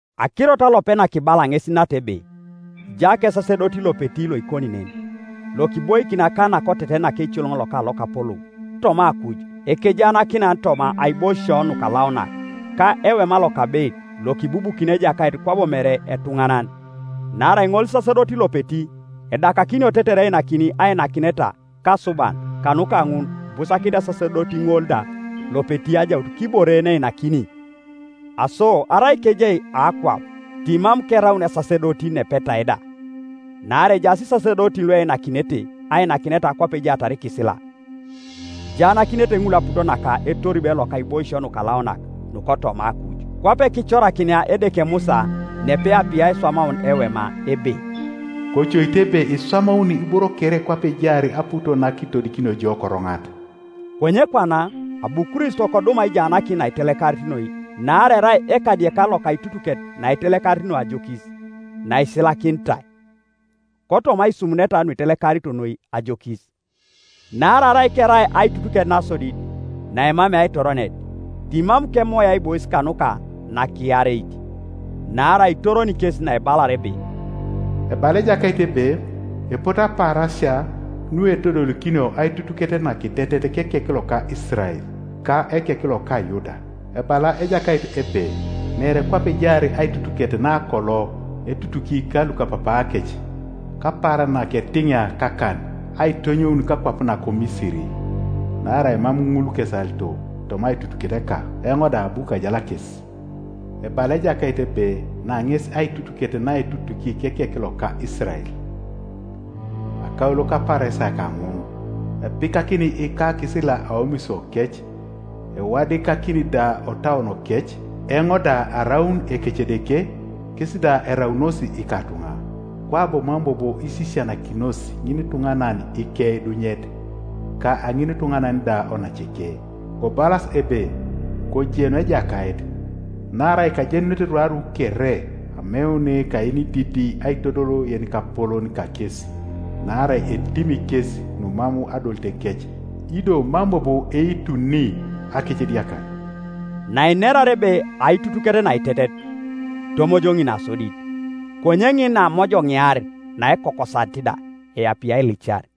Akirot alopet nakibala ŋes nata ebe: kija kesasedoti lopeti loikoni nen, lokiboikin akan nakoteten naka eicoloŋ naka Lokapolou toma akuj, ekejaanakinan toma aiboisio nukalaunak, ka ewema lokabeit, lokibubukini Ejakait kwabo mere etuŋanan, Naarai ŋolisasedoti lopeti edakakinio tetere einakini ainakineta ka asuban; kanuka ŋun ibusakinit esasedoti ŋol da lopeti ajaut kibore yeneinakini. Aso arai kejai akwap, timam keraun esasedoti nepetai da, naarai ejaas isasedotin lueinakinete ainakineta kwape ejaatar ikisila. Ijaanakinete ŋul aput ka etoribe loka aiboisio nukalaunak nukotoma akuj; kwape kicorakinia Edeke Musa napeapie aiswamaun ewema ebe, “Kocoite ebe iswamauni iboro kere kwape ejaar aput nakiitodikinio jo koroŋat.” Konye kwana abu Kristo kodum aijaanakin naitelekarit noi, naarai erai ekadiekan loka aitutuket naitelekarit noi ajokis, naisilakinitai kotoma aisumuneta nuitelekarito noi ajokis. Naarai arai kerai aitutuket nasodit naemamei aitoronet timam kemoi aibois kanuka nakiareit. Naarai itoroni kes naebalar ebe: “Ebala Ejakait ebe, epote apaarasia, Nuetodolikinio aitutuket nakitetet kekek loka Isirael, Ka ekek loka Yuda. Ebala Ejakait ebe, Mere kwape ejaar aitutuket nakolo etutuki ka lukapapaakec Kapaaran naketiŋia kakan aitonyoun kakwap nako Misiri; Naarai mam ŋul kesalito toma aitutuketeka, Eoŋ da abu kajal kes. Ebala Ejakait ebe, Na ŋes aitutuket naetutuki kekek loka Isirael, Akaulo kapaarasia kaŋun; Epikakini ikakisila aomisiokec, Ewadikakini da otauonokec; Eoŋ da araun Ekecedeke, Kes da eraunos ikatuŋa. Kwabo mam bobo isisianakinos ŋinituŋanan ikeidunyet, Ka ŋinituŋanan da onaceke, kobalas ebe, ‘Kojen Ejakait,’ Naarai kajenunete rwaru kere, Ameun ka yenididi aitodol yenikapolon kakesi. Naarai etimi kes numam adolitekec, Ido mam bobo eituni akecediakar.” Nainerar ebe Aitutuket nakitetet, itomojoŋi nasodit. Konye ŋin naamojoŋiar, naekokosanit da eapie ailicar.